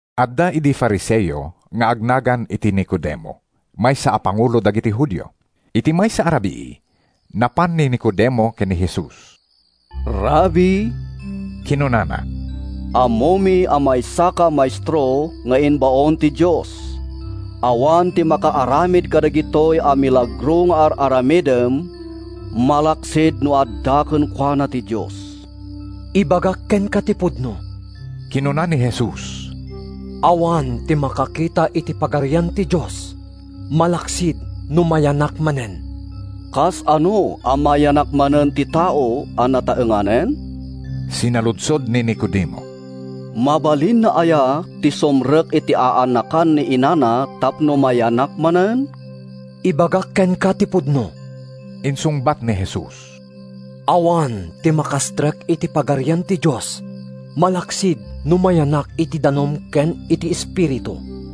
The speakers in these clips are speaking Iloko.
Adda idi Fariseo nga agnagan iti Nicodemo, maysa a pangulo dagiti Judio. Iti maysa a rabii, napan ni Nicodemo ken ni Jesus. “Rabbi,” kinunana, “ammomi a maysaka a maestro nga imbaon ti Dios. Awan ti makaaramid kadagitoy a milagro nga ar-aramidem malaksid no adda kenkuana ti Dios.” “Ibagak kenka ti pudno,” kinuna ni Jesus. “Awan ti makakita iti Pagarian ti Dios malaksid no mayanak manen.” “Kasano a mayanak manen ti tao a nataenganen?” sinaludsod ni Nicodemo. “Mabalinna aya ti sumrek iti aanakan ni inana tapno mayanak manen?” “Ibagak kenka ti pudno,” insungbat ni Jesus. “Awan ti makastrek iti Pagarian ti Dios malaksid no mayanak iti danum ken iti Espiritu.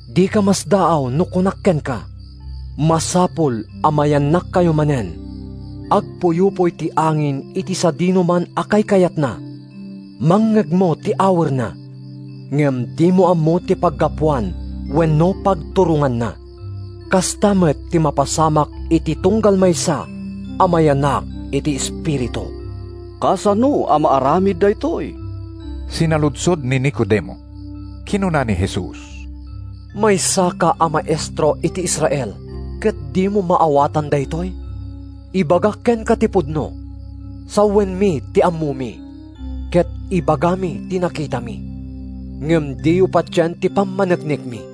Dika masdaaw no kunak kenka, ‘Masapul a mayanakkayo manen.’ Agpuyupoy ti angin iti sadinoman a kaykayatna. Mangngegmo ti awerna, ngem dimo ammo ti paggapuan wenno pagturonganna. Kasta met ti mapasamak iti tunggal maysa a mayanak iti Espiritu.” “Kasano a maaramid daytoy?” sinaludsod ni Nicodemo. Kinuna ni Jesus, “Maysaka a maestro iti Israel ket dimo maawatan daytoy? Ibagak kenka ti pudno: Sawenmi ti ammomi, ket ibagami ti nakitami. Ngem diyo patien ti pammaneknekmi.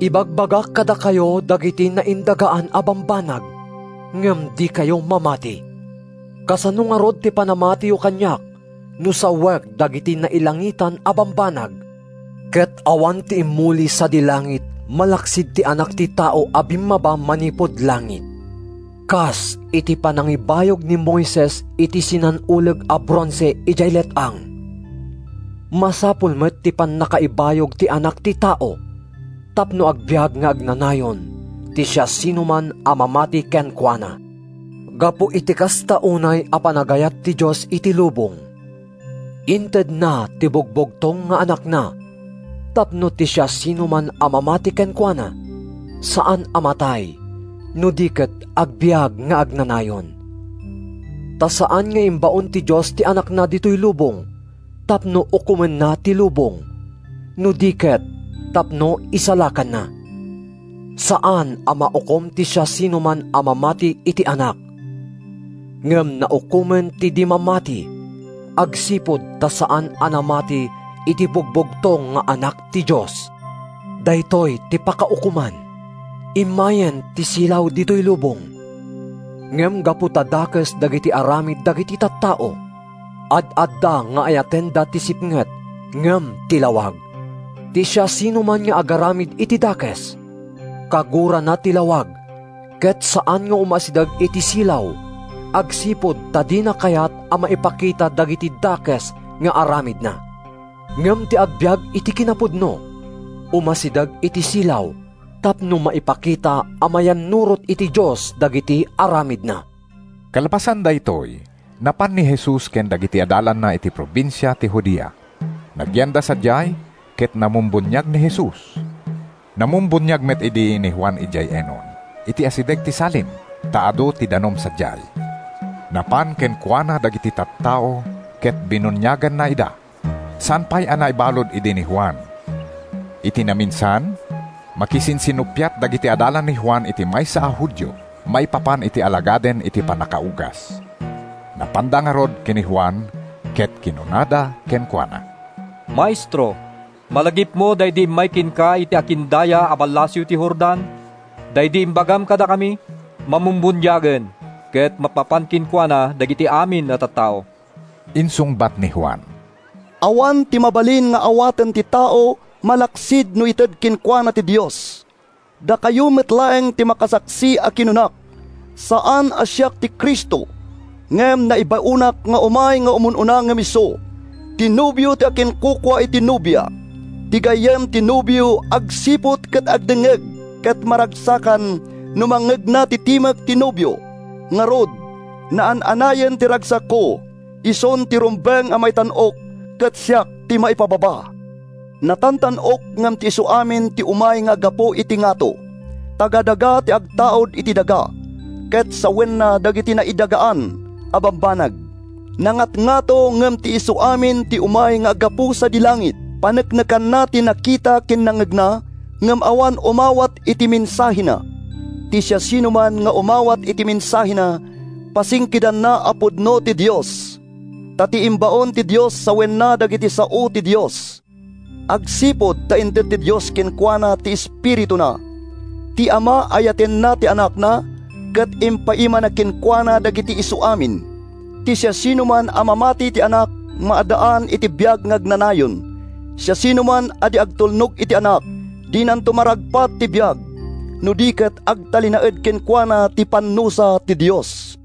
Ibagbagak kadakayo dagiti naindagaan a bambanag, ngem dikayo mamati. Kasano ngarud ti panamatiyo kaniak no sawek dagiti nailangitan a bambanag? Ket awan ti immuli sadi langit malaksid ti Anak ti Tao a bimmaba manipud langit. Kas iti panangibayog ni Moises iti sinan-uleg a bronse idiay let-ang, masapul met ti pannakaibayog ti Anak ti Tao tapno agbiag nga agnanayon ti siasinoman a mamati kenkuana.” Gapu iti kasta unay a panagayat ti Dios iti lubong, intedna ti Bugbugtong nga Anakna tapno ti siasinoman a mamati kenkuana saan a matay no di ket agbiag nga agnanayon. Ta saan nga imbaon ti Dios ti Anakna ditoy lubong tapno ukomenna ti lubong, no di ket tapno isalakanna. Saan a maukom ti siasinoman a mamati iti Anak. Ngem naukomen ti di mamati agsipud ta saan a namati iti Bugbugtong nga Anak ti Dios. Daytoy ti pakaukoman: Immayen ti silaw ditoy lubong, ngem gapu ta dakes dagiti aramid dagiti tattao, ad-adda nga ayatenda ti sipnget ngem ti lawag. Ti siasinoman nga agaramid iti dakes, kagurana ti lawag ket saan nga umasideg iti silaw agsipud ta dina kayat a maipakita dagiti dakes nga aramidna. Ngem ti agbiag iti kinapudno, umasideg iti silaw tapno maipakita a mayannurot iti Dios dagiti aramidna. Kalpasan daytoy, napan ni Jesus ken dagiti adalanna iti probinsia ti Judea. Nagyanda sadiay ket namumbuniag ni Jesus. Namumbuniag met idi ni Juan idiay Enon, iti asideg ti Salim, ta adu ti danum sadiay. Napan kenkuana dagiti tattao ket binuniaganna ida. ( Saan pay a naibalud idi ni Juan.) Iti naminsan, makisinsinnuppiat dagiti adalan ni Juan iti maysa a Judio maipapan iti alagaden iti pannakaugas. Napanda ngarud ken ni Juan ket kinunada kenkuana, “Maestro, malagipmo daydi immay kenka iti akindaya a ballasiw ti Jordan, daydi imbagam kadakami? Mamumbuniagen, ket mapmapan kenkuana dagiti amin a tattao!” Insungbat ni Juan, “Awan ti mabalin nga awaten ti tao malaksid no ited kenkuana ti Dios. Dakayo met laeng ti makasaksi a kinunak, ‘Saan a siak ti Cristo, ngem naibaonak nga umay nga umun-una ngem isu.’ Ti nobio ti akinkukua iti nobia; ti gayyem ti nobio agsiput ken agdengngeg ket maragsakan no mangngegna ti timek ti nobio. Ngarud, naan-anayen ti ragsakko. Isun ti rumbeng a maitan-ok, ket siak ti maipababa.” Natantan-ok ngem ti isuamin ti umay nga aggapu iti ngato. Taga-daga ti agtaud iti daga, ket sawenna dagiti naidagaan a bambanag. Nangatngato ngem ti isuamin ti umay nga aggapu sadi langit. Paneknekanna ti nakita ken nangngegna, ngem awan umawat iti mensahena. Ti siasinoman nga umawat iti mensahena, pasingkedanna a pudno ti Dios. Ta ti imbaon ti Dios sawenna dagiti sao ti Dios, agsipud ta inted ti Dios kenkuana ti Espirituna. Ti Ama ayatenna ti Anakna ket impaimana kenkuana dagiti isuamin. Ti siasinoman a mamati iti Anak maaddaan iti biag nga agnanayon. Siasinoman a di agtulnog iti Anak, dinanto maragpat ti biag, no di ket agtalinaed kenkuana ti pannusa ti Dios.